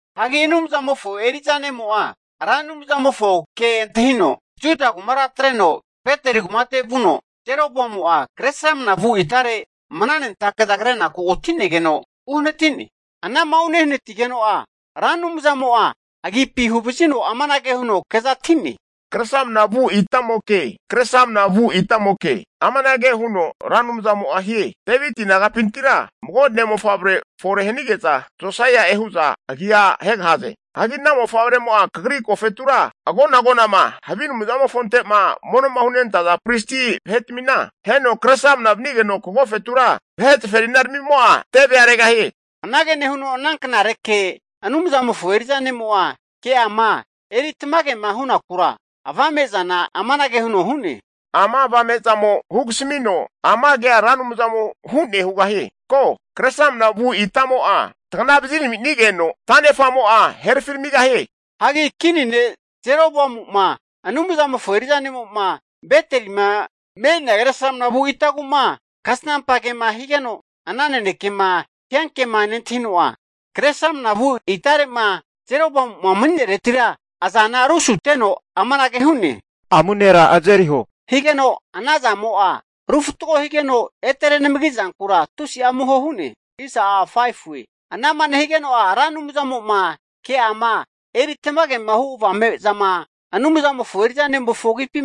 Hagi Anumzamofo eri'za ne'mo'a Ra Anumzamofo ke antahino Juda kumara atreno Beteli kumate vuno Jeroboamu'a Kresramana vu itare mnanentake'za krenaku oti'negeno uhanati'ne. Anama unehanatigeno'a Ra Anumzamo'a agipi huvazino amanage huno kezati'ne, kresramna vu itamoke, kresramna vu itamoke! Amanage huno Ra Anumzamo'a hie, Deviti nagapintira mago ne'mofavre fore hanige'za Josaia'e hu'za agia ahegahaze. Hagi ana mofavremo'a kagri agofetura agona agonama havi anumzamofonte'ma mono'ma hunentaza pristi vahe'tmina aheno kresramna vanigeno, kagofetura vahe zaferinaramimo'a tevea regahie. Anage nehuno ana knareke Anumzamofo eri'za ne'mo'a ke'ama eri tamagema hunakura, avame'zana amanage huno hu'ne, ama avame'zamo hugasamino ama kea Ra Anumzamo hu'ne hugahie, ko, kresramna vu itamo'a tagana vaziraminigeno, tanefamo'a herafiramigahie. Hagi Kini ne' Jeroboamu'ma Anumzamofo eri'za ne'mo'ma Betelima me'nea kresramna vu itagu'ma, kasnampa kema higeno, ana nanekema hiankema nentahino, kre sramnavu itare'ma Jeroboamu'ma mani'nereti azana rusuteno amanage hu'ne, amu nera azeriho, higeno ana zamo'a ru fatgo higeno, ete renamagi zankura tusi amuho hu'ne. Ana'ma nehigeno'a Ra Anumzamo'ma ke'ama eri tamagema hu avame'zama Anumzamofo eri'za ne'mofo agipi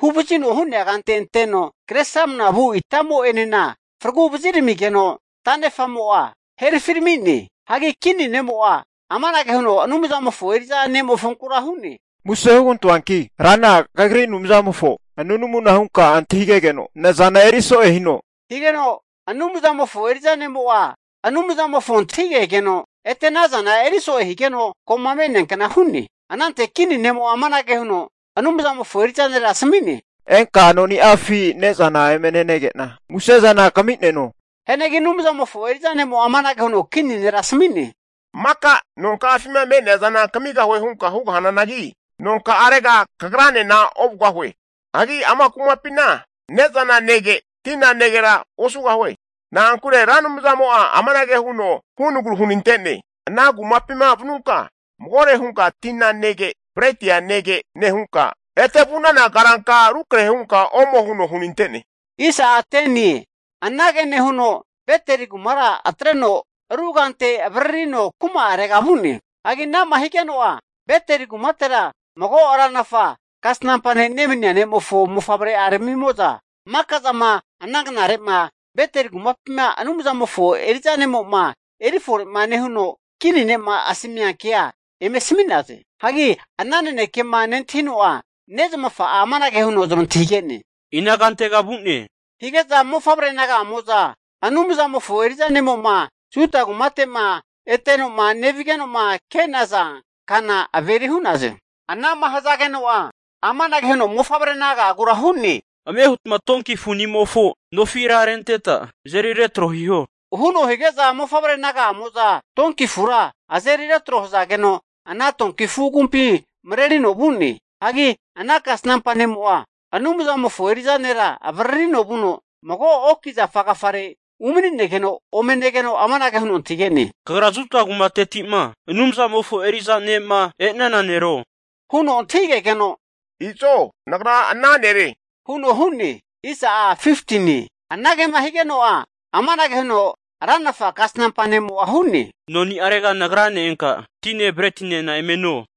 huvazino hu'nea kante anteno kresramna vu itamo'enena fragu vaziramigeno tanefa'mo'a herafirami'ne. Hagi kini ne'mo'a amanage huno Anumzamofo eri'za ne'mofonkura hu'ne, muse hugantoanki, Rana kagri Anumzamofo nunamuna hunka antahigegeno nazana eriso'e hino, higeno Anumzamofo eri'za ne'mo'a Anumzamofo antahigegeno, ete ana azana eriso'e higeno ko'ma me'neankna hu'ne. Anante kini ne'mo'a amanage huno Anumzamofo eri'za nera asami'ne, enka noni'afi ne'zana eme nenege'na musezana kami'neno. Hianagi Anumzamofo eri'za ne'mo'a amanage huno kini nera asami'ne, Maka nonka'afima me'neazana amu'nompinti refko hunka kamigahue hugahananagi, nonka'arega kagranena ovugahue. Hagi ama kumapina ne'zana nege, tina negera osugahue. Na'ankure Ra Anumzamo'a amanage huno hunagru hunante'ne, Ana kumapima vanunka magore hunka tina nege, bretia nege, nehunka ete vu'nana karanka rukrahe hunka omo huno hunante'ne. Anage nehuno Beteli kumara atreno ru kante avaririno kuma'arega vu'ne. Hagi ana'ma higeno'a, Beteli kumatera mago ranafa kasnampa ne' nemania ne'mofo mofavre'aramimo'za, maka zama ana knare'ma Beteli kumapima Anumzamofo eri'za ne'mo'ma eri fore'ma nehuno, kini ne'ma asamia kea eme asami'naze. Hagi ana nanekema nentahino'a nezamafa'a amanage huno zamantahigene, ina kantega vu'ne? Hige'za mofavre naga'amo'za Anumzamofo eri'za ne'mo'ma Juda kumate'ma eteno'ma nevige'noma ke'naza kana averi hu'naze. Ana'ma hazageno'a amanage huno mofavre naga'agura hu'ne. Ame hutma donki afu'nimofo nofira renteta azeri retro hiho, huno hige'za mofavre naga'amo'za donki afura azeri retro hazageno, ana donki afu agumpi marerino vu'ne. Hagi ana kasnampa ne'mo'a Anumzamofo eri'za nera avaririno vuno mago oki zafa agafare umaninegeno, ome negeno amanage huno antahige'ne. Kagra Juda kumateti'ma Anumzamofo eri'za ne'ma e'nana nero? Huno antahigegeno, Izo nagra ana nere huno hu'ne. Anagema higeno'a, amanage huno ranafa kasnampa ne'mo'a hu'ne, Noni'arega nagrane enka tine bretinena eme no.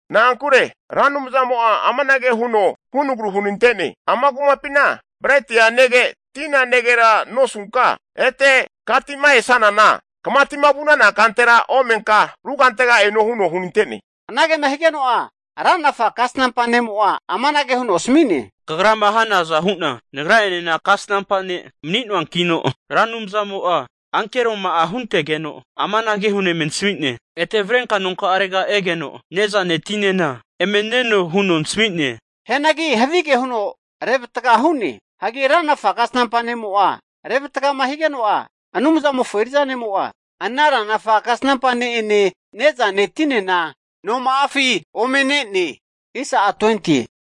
Na'ankure Ra Anumzamo'a amanage huno hunagru hunantene. Ana kumapina bretia nege tina negera nosunka, ete katima esanana, kamati'ma vu'nana kantera omenka ru kantega eno huno hunante'ne. Anagema higeno'a ranafa kasanampa ne'mo'a amanage huno asami'ne, Kagrama hanaza hu'na nagra'enena kasnampa ne' mani'noankino, Ra Anumzamo'a ankeroma'a huntegeno amanage huno eme nasami'ne, Ete avrenka nonka'arega egeno ne'zane tinena eme neno huno nasmi'ne. Hianagi havige huno revatga hu'ne. Hagi ranafa kasnampa nemo'a revatgama higeno'a, Anumzamofo eri'za ne'mo'a, ana ranafa kasanampa ne'ene ne'zane tinena noma'afi ome ne'ne.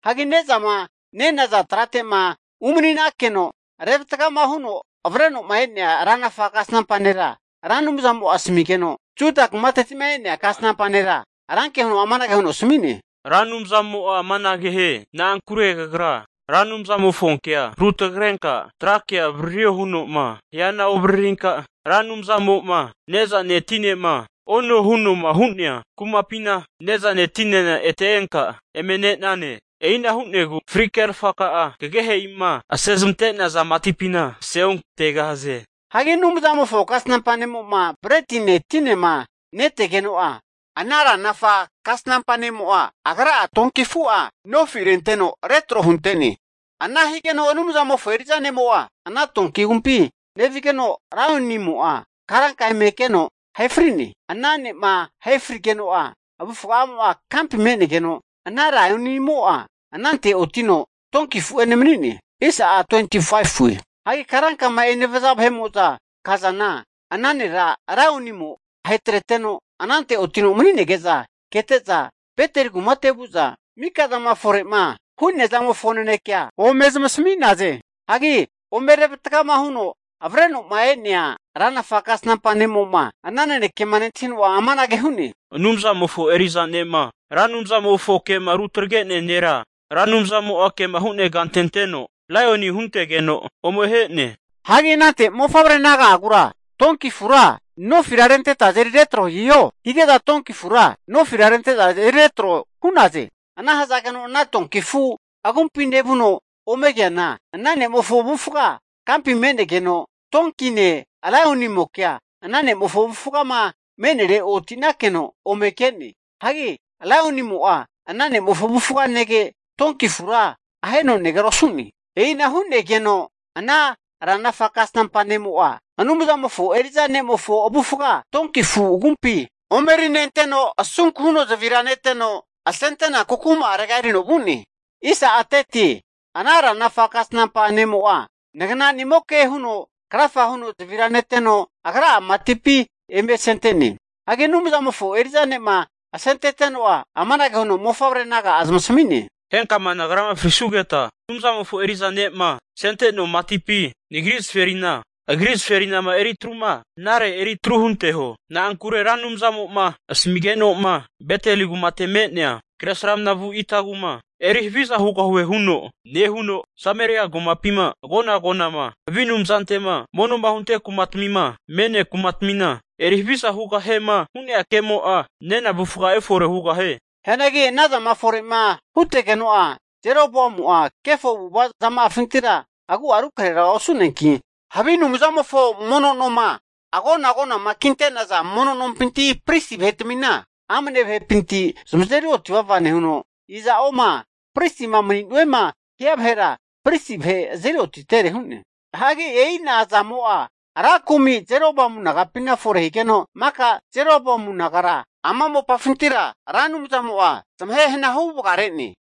Hagi ne'zama nenaza trate'ma umani'nakeno revatgama huno avreno'ma e'nea ranafa kasnampa nera Ra Anumzamo'a asamigeno, Juda kumateti'ma e'nea kasnampa nera ranke huno amanage huno asmi'ne, Ra Anumzamo'a amanage hie, Na'ankure kagra Ra Anumzamofonkea rutagrenka trake'a avaririo huno'ma hiana ovaririnka, Ra Anumzamo'ma ne'zane tinema ono huno'ma hu'nea kumapina ne'zane tinena ete enka eme ne'nane. E'ina hu'negu fri kerfaka'a kagehe'ima asezamante'naza matipina aseogantegahaze. Hagi Anumzamofo kasnampa ne'mo'ma bretine tinema netegeno'a, ana ranafa kasnampa ne'mo'a agra'a donki afu'a nofi renteno retro hunte'ne. Ana higeno Anumzamofo eri'za ne'mo'a ana donki agumpi nevigeno, laionimo'a karanka eme keno ahe fri'ne. Ana ne'ma ahe frigeno'a, avufgamo'a kampi me'negeno, ana laionimo'a anante otino donki afu'ene mani'ne. Hagi karankama enevaza vahe'mo'zama kazana, ana nera laionimo ahetreteno anante otino mani'nege'za kete'za Beteli kumate vu'za mikazama fore'ma hu'nea zamofo nanekea ome zamasami'naze. Hagi ome revatgama huno avreno'ma e'nea ranafa kasnampa ne'mo'ma ana nanekema nentahino'a amanage huno hu'ne, Anumzamofo eri'za ne'ma Ra Anumzamofo ke'ma rutagre'nea nera, Ra Anumzamo'a kema hu'nea kante anteno laioni huntegeno ome ahe'ne. Nehuno anante mofavre naga'agura donki afura nofira renteta azeri retro hiho, hige'za donki afura nofira rente'za azeri retro hu'naze. Ana hazageno, ana donki afu agumpi nevuno ome keana ana ne'mofo avufga kampi me'negeno donkine lionimokea ana ne'mofo avufgama me'nere otinakeno ome ke'ne. Hagi Laionimo'a ana ne'mofo avufga nege, donki afura aheno negera osu'ne. E'ina hu'negeno ana ranafa kasnampa ne'mo'a, Anumzamofo eri'za ne'mofo avufga donki afu agumpi ome erinenteno, asunku huno zavira neteno asente'naku kuma'arega erino vu'ne. Hagi ana ranafa kasnampa ne'mo'a, nafu nagnanimoke huno krafa huno zavira neteno, agra'a matipi eme asente'ne. Hagi Anumzamofo eri'za ne'ma asenteteno'a amanage huno mofavre naga'a zamasami'ne, henkama nagrama frisugeta, Anumzamofo eri'za ne'ma asente'noa matipi, nagri zaferina agri zaferinama eritruma hanare eritru hunteho. Na'ankure Ra Anumzamo'ma asamigeno'ma Beteli kumate'ma me'nea kresramna vu itagu'ma eri haviza hugahue huno nehuno, Sameria kumapima agona agonama havi anumzante'ma mono'ma hunte kumatmima me'nea kumatmina eri haviza hugahiema hu'nea ke'mo'a nena avufga'a efore hugahie. Hianagi ana zama fore'ma hutegeno'a, Jeroboamu'a kefo avu'ava zama'afintira agu'a rukrahera osu'neanki, havi anumzamofo mono noma agona agonama kinte'naza mono nompina pristi vahetmina, amne vahepinti zamazeri oti vava nehuno, iza'oma pristima mani'nuema hia vahera pristi vahe azeri otitere hu'ne. Hagi e'ina zamo'a ra kumi Jeroboamu nagapina fore higeno, maka Jeroboamu nagara ama mopafintira Ra Anumzamo'a zamahe hana hu vagare'ne.